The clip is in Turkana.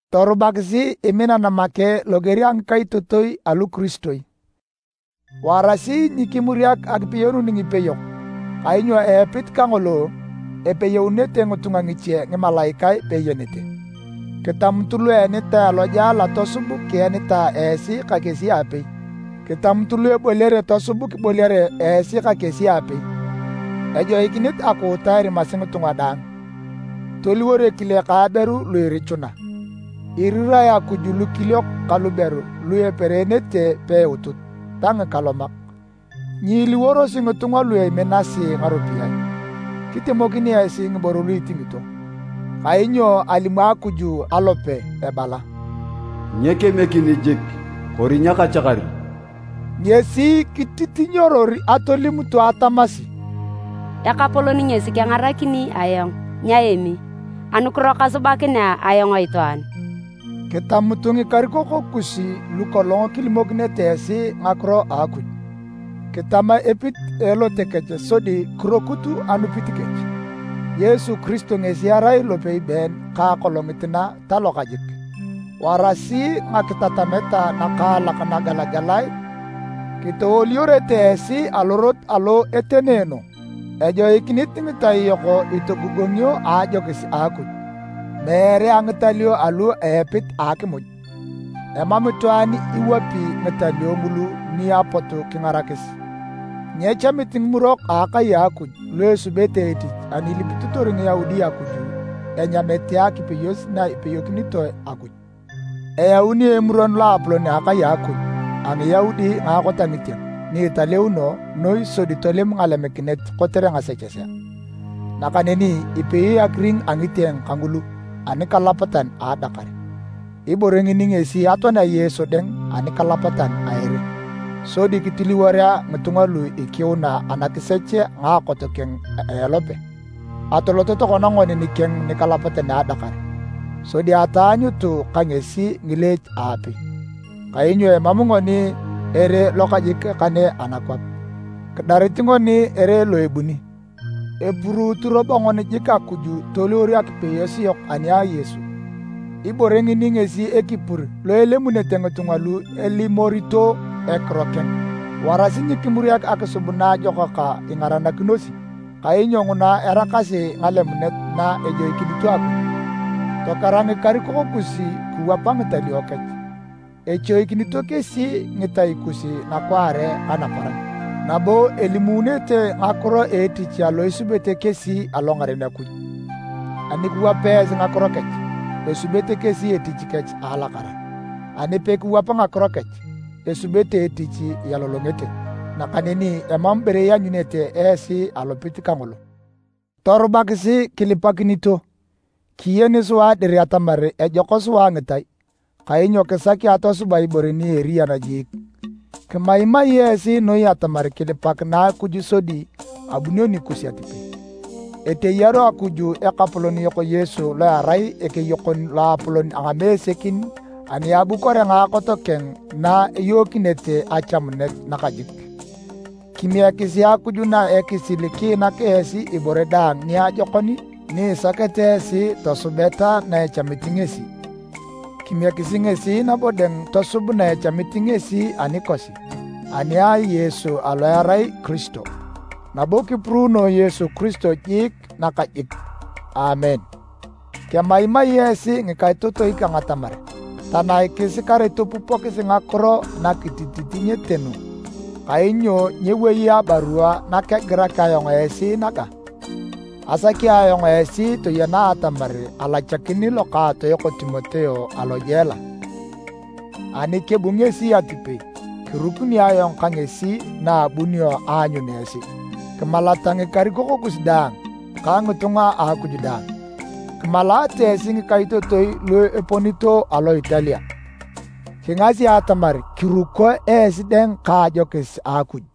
Torubakisi iminan make loger a ngikaitotoi alukiristoi. Warasi nyikimuriak akipeyounun ngipeyok, kainyo a epit kangolo, epeyounete ngitunga ngiche ngimalaikae peeyenete. Kitamutu lu eenitae alojela tosub kienitae esi ka kesi aapei. Kitamutu lu eboliare tosub kiboliare esi ka kesi aapei. Ejoikinit akuuta erimasi ngitunga daang, toliwor ekile ka aberu lu irichuna. Irirae Akuj lukiliok ka luberu lu epereenete peiutut, ta ngikalomak. Nyiiliworosi ngitunga lu eminasi ngaropiyae. Kitemokin esi ngiboro lu itingito. Kainyo alimu Akuj alope ebala, “Nyekemiekini jik, kori nyakachakari.” Ngesi kititinyoror atolimutu atamasi, “Ekapolon ngesi kengarakini ayong, nyaemi. Anukiro kasubakinea ayong itwaan?” Kitamutu ngikarikok kus lu kolong kilimokinete esi ngakiro a Akuj. Kitama epit a elote kech sodi kirokut anupit kech. Yesu Kiristo ngesi erai lopei been ka akolongit na ta lokajik. Warasi ngakitatamet ngakaalak nagelagelae kitowoliorete esi alorot alo etenoono. Ejoikinit ngitai yok itogogongio a ajokis a Akuj, meere a ngitalio alu a epit a akimuj. Emam itwaan ni ewap ngitalio ngulu ni apot kingarakis. Nyechamit ngimurok a akai a Akuj lu esubete etich ani ilipitotor Ngiyaudi Akuj enyamete akipeyos na ipeyokinitoe Akuj. Eyauni Emuron Loapolon a akai a Akuj a Ngiyaudi ngaakot a ngitieng ni Italeuno Noi sodi tolemu ngalemikinet kotere ngasechesea. Nakaneni ipeyoe akiring a ngitieng kangulu anikalapatan a adakar. Ibore ngini ngesi atoanea Yesu dang anikalapatan a ere, sodi kitiliworea ngitunga lu ikiuna anakisech a ngaakot keng a elope. Atoloto tokona ngoni nikeng nikalapatan a adakar, sodi ataanyutu ka ngesi ngileech aapei. Kainyo emam ngoni ere lokajik kane anakwap. Kidarit ngoni ere lo ebuni. Epuruutu robo ngoni jiik Akuj toliwor akipeyos yok ani a Yesu. Ibore ngini ngesi ekipur lo elimunete ngitunga lu elimorito ekiro keng. Warasi nyikimuriak akisub naajokak ingaranakinosi, kainyo nguna eraakasi ngalemunet na ejoikinito Akuj. Tokera ngikarikok kus kiwapa ngitalio kech. Echoikinito kesi ngitai kus nakwaare ka naparan, nabo elimuunete ngakiro a etich alo asubete kesi alongaren Akuj. Ani kiwap esi ngakiro kech, esubete kesi etich kech elakara. Ani pekiwap ngakiro kech, esubete etich ialolongete nakaneni emam ibore ianyunete esi alopit kangolo. Torubakisi kilipakinito. Kiyeni sua dir atamar ejok sua ngitai, kainyo kisaki atosuba ibore ni eriyan jiik. Kemaimai esi noi atamar kilipakinae Akuj sodi abunio nikus atipei. Eteyaru Akuj Ekapolon yok Yesu lo erai Ekeyokon Loapolon a ngamesekin ani abukorea ngaakot keng na eyookinete achamunet nakajik. Kimiekisi Akuj na a ekisil kiinak esi ibore daang niajokon ni isakete esi tosubeta na echamit ngesi. Kimiekisi ngesi nabo dang tosub na echamit ngesi anikosi, ani a Yesu alo erai Kiristo. Nabo kipuruunoe Yesu Kiristo jik nakajik! Aamen. Kemaimai esi ngikaitotoi kang atamar tanaikisi kare topupokis ngakiro nakitititinyete nu. Kainyo nyewoi abarua nakegirak ayong esi naga. Asaki ayong esi toyena atamar alachakin lokaatoyok Timoteo alojela. Ani kebu ngesi atipei, kirukuni ayong ka ngesi na abunio aanyun esi. Kimalata ngikarikok kus daang ka ngitunga a Akuj daang. Kimalaate esi ngikaitotoi lu eponito alo Italia. Kigasi atamar kiruko esi daang ka ajokis a Akuj.